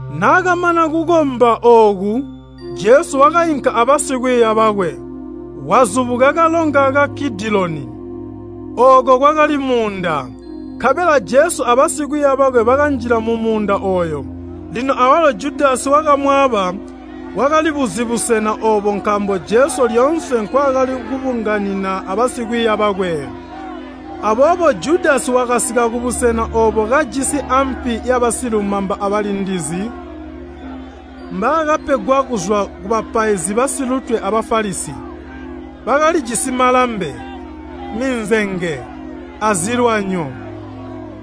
Naakamana kukomba ooku, Jesu wakainka abasikwiiya bakwe, wazubuka kalonga ka Kidiloni. Ooko kwakali muunda, nkabela Jesu abasikwiiya bakwe bakanjila mumuunda ooyo. Lino awalo Judasi wakamwaaba, wakalibuzi busena oobo nkaambo Jesu lyoonse nkwaakali kubunganina abasikwiiya bakwe. Aboobo Judasi wakasika kubusena oobo kajisi ampi yabasilumamba abalindizi mbaakapegwa kuzwa kubapaizi basilutwe a Bafalisi. Bakalijisi malambe, minzenge, azilwanyo.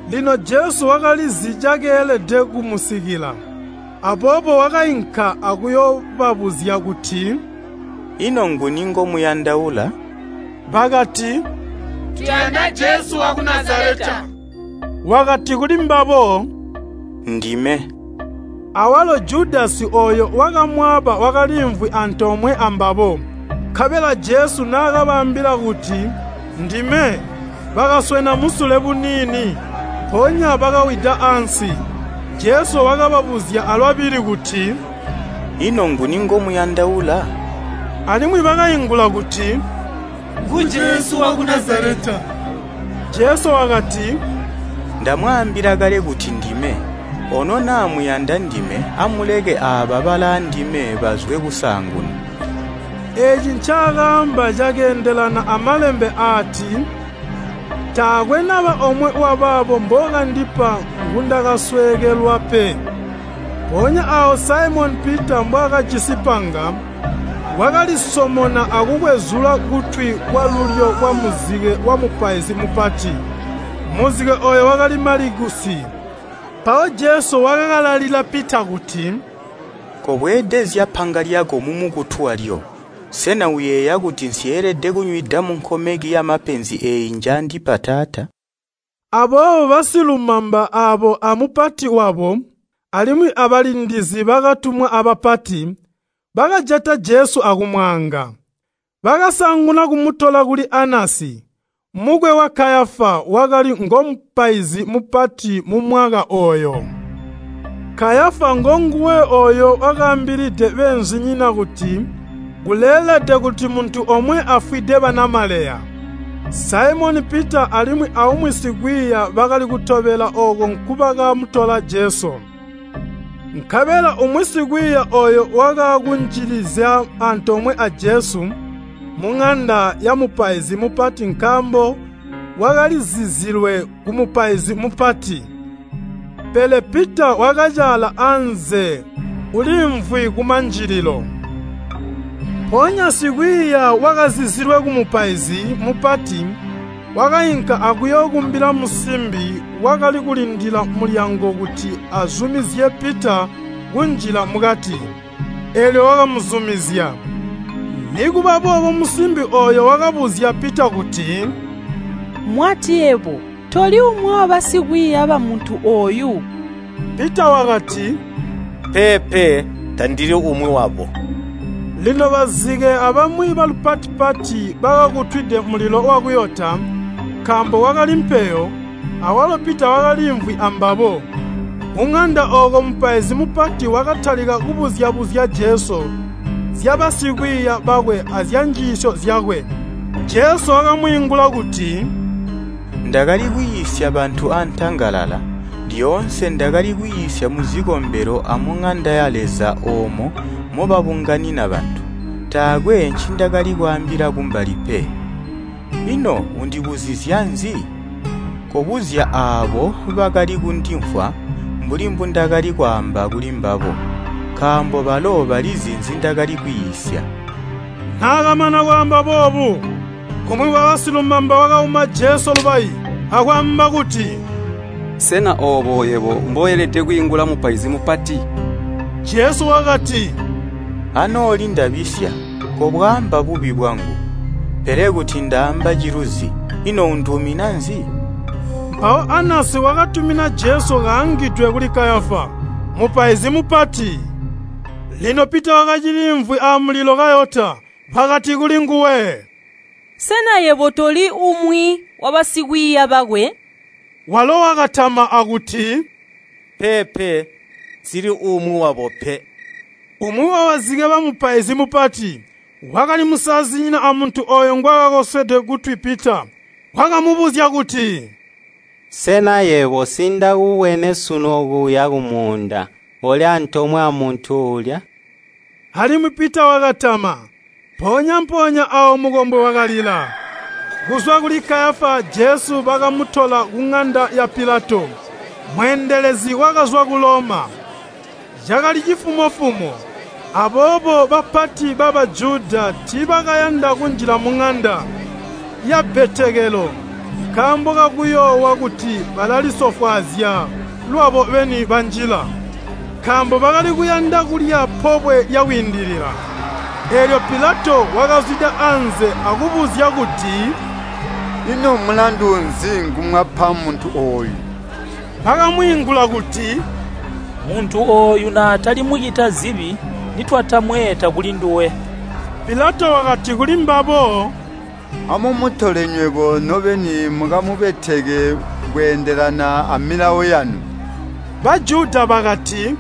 Lino Jesu wakalizi cakeelede kumusikila, aboobo wakainka akuyoobabuzya kuti, “Ino nguni ngomuyandaula?” Bakati, “Tuyanda Jesu waku Nazaleta.” Wakati kulimbabo, “Ndime.” Awalo Judasi ooyo wakamwaaba wakaliimvwi antoomwe ambabo. Nkabela Jesu naakabaambila kuti, “Ndime,” bakaswena musule buniini, mpoonya bakawida ansi. Jesu wakababuzya alwabili kuti, “Ino nguni ngomuyandaula?” Alimwi bakaingula kuti, “Ngu Jesu waku Nazaleta.” Jesu wakati, “Ndamwaambila kale kuti ndime. Ono naa muyanda ndime amuleke aaba balaandime bazwe kusaanguna.” Eeci ncakaamba cakeendelana a Malembe aati, “Taakwe naba omwe wabaabo mbookandipa ngundakasweekelwa pe.” Mpoonya aawo Saimoni Pita mbwaakajisi panga, wakalisomona akukwezula kutwi kwalulyo kwamuzike wamupaizi mupati. Muzike ooyo wakali Malikusi. Mpawo Jesu wakakalalila Pita kuti, “Kobweedezya panga lyako mumukutu walyo. Sena uyeeya kuti nsyeelede kunywida munkomeki yamapenzi eeyi njaandipa Taata?” Aboobo basilumamba aabo amupati wabo, alimwi abalindizi bakatumwa abapati, bakajata Jesu akumwaanga. Bakasaanguna kumutola kuli Anasi, mukwe wa Kayafa wakali ngomupaizi mupati mumwaka ooyo. Kayafa ngonguwe ooyo wakaambilide beenzinyina kuti kuleelede kuti muntu omwe afwide banamaleya. Saimoni Pita alimwi aumwi sikwiiya bakali kutobela ooko nkubakamutola Jesu. Nkabela umwi sikwiiya ooyo wakaakunjililizya antoomwe a Jesu muŋanda yamupaizi mupati nkaambo wakalizizilwe kumupaizi mupati. Pele Pita wakacaala anze uliimvwi kumanjililo. Mpoonya sikwiiya wakazizilwe kumupaizi mupati wakainka akuyookumbila musimbi wakali kulindila mulyango kuti azumizye Pita kunjila mukati, eelyo wakamuzumizya. Nikuba boobo musimbi ooyo wakabuzya Pita kuti, “Mwati yebo toli umwi wabasikwiiya bamuntu ooyu?” Pita wakati, “Peepe, tandili umwi wabo.” Lino bazike abamwi balupati-pati bakakutwide mulilo wakuyota, nkaambo kwakali mpeyo. Awalo Pita wakaliimvwi ambabo. Kuŋanda ooko mupaizi mupati wakatalika kubuzya-buzya Jesu zyabasikwiiya bakwe azyanjiisyo zyakwe. Jesu wakamwiingula kuti, “Ndakali kwiisya bantu antangalala. Lyoonse ndakali kwiisya muzikombelo amuŋanda ya Leza oomo mobabunganina bantu. Taakwe ncindakali kwaambila kumbali pe. Ino undibuzizya nzi? Kobuzya aabo bakali kundimvwa mbuli mbundakali kwaamba kulimbabo, nkaambo balo balizi nzindakali kwiisya.” Naakamana kwaamba boobu, umwi wabasilumamba wakauma Jesu lubayi, akwaamba kuti, “Sena oobo yebo mboelede kwiingula mupaizi mupati?” Jesu wakati, “Anooli ndabisya, kobwaamba bubi bwangu, pele kuti ndaamba ciluzi, ino unduumina nzi?” Mpawo Anasi wakatumina Jesu kaangidwe kuli Kayafa, mupaizi mupati. Lino Pita wakaciliimvwi amulilo kayota. Bakati kulinguwe, “Sena yebo toli uumwi wabasikwiiya bakwe?” Walo wakatama akuti, “Peepe, nsili uumwi wabo pe.” Umwi wabazike bamupaizi mupati, wakali musazinyina amuntu ooyo ngwaakakoswede kutwi Pita, wakamubuzya kuti, “Sena yebo nsiindakubwene sunu okuya kumuunda koli antoomwe amuntu uulya?” Alimwi Pita wakatama. Mpoonya-mpoonya aawo mukombwe wakalila. Kuzwa kuli Kayafa Jesu bakamutola kuŋanda ya Pilato, mweendelezi wakazwa ku Loma. Cakali cifumo-fumo, aboobo bapati ba Bajuda tiibakayanda kunjila muŋanda yabbetekelo nkaambo kakuyoowa kuti balalisofwaazya lwabo beni banjila. Nkaambo bakali kuyanda kulya Pobwe lya Kwiindilila. Eelyo Pilato wakazwida anze akubuzya kuti, “Ino mulandu nzi ngumwapa muntu ooyu?” Bakamwiingula kuti, “Muntu ooyu naatali mucita zibi, nitwatamweeta kulinduwe.” Pilato wakati kulimbabo, “Amumutole nywebo nobeni mukamubeteke kweendelana a Milawo yanu.” Bajuda bakati,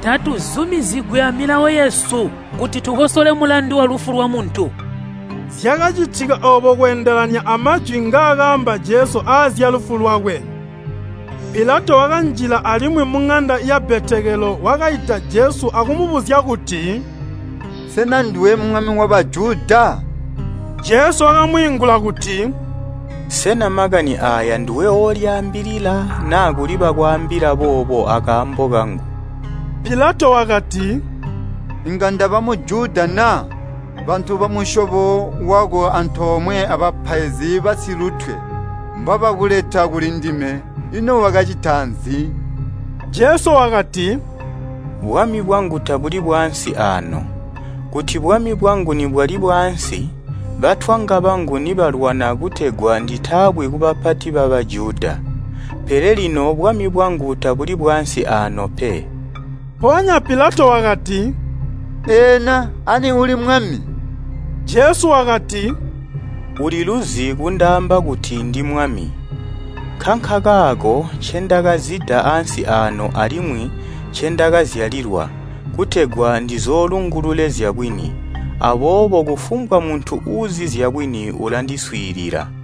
“Tatuzumizigwi a Milawo yesu kuti tukosole mulandu walufu lwamuntu.” Zyakacitika oobo kweendelana amajwi ngaakaamba Jesu aazyalufu lwakwe. Pilato wakanjila alimwi muŋanda yabbetekelo, wakaita Jesu akumubuzya kuti, “Sena nduwe Mwami wa Bajuda?” Jesu wakamwiingula kuti, “Sena makani aaya nduwe oolyaambila naa kuli bakwaambila boobo akaambo kangu?” Pilato wakati, “Inga ndaba Mujuda na? Bantu bamusyobo wako antoomwe abapaizi basilutwe mbabakuleta kulindime, ino wakacita nzi?” Jesu wakati, “Bwami bwangu tabuli bwaansi aano. Kuti bwamwi bwangu nibwali bwaansi, batwanga bangu nibalwana kutegwa nditaabwi kubapati ba Bajuda. Pele lino bwami bwangu tabuli bwaansi aano pe.” Mpoonya Pilato wakati, “Eena ani uli mwami?” Jesu wakati, “Uliluzi kundaamba kuti ndimwami. Nkankakaako ncendakazida ansi aano alimwi ncendakazyalilwa, kutegwa ndizoolungulule zyabwini, aboobo kufumbwa muntu uuzi zyabwini ulandiswiilila.”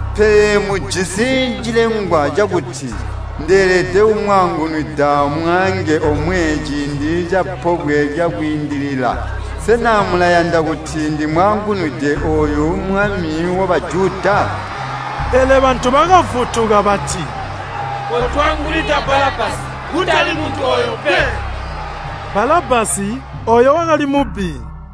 Pele mujisi cilengwa cakuti ndeelede kumwaangunwida mwaange omwe ciindi ca Pobwe lya Kwiindilila. Sena mulayanda kuti ndimwaangunwide ooyu Mwami wa Bajuda?” Pele bantu bakavutuka bati, “Kotwaangunwida Balabbasi, kutali muntu ooyu pe!” Balabbasi ooyo wakali mubbi.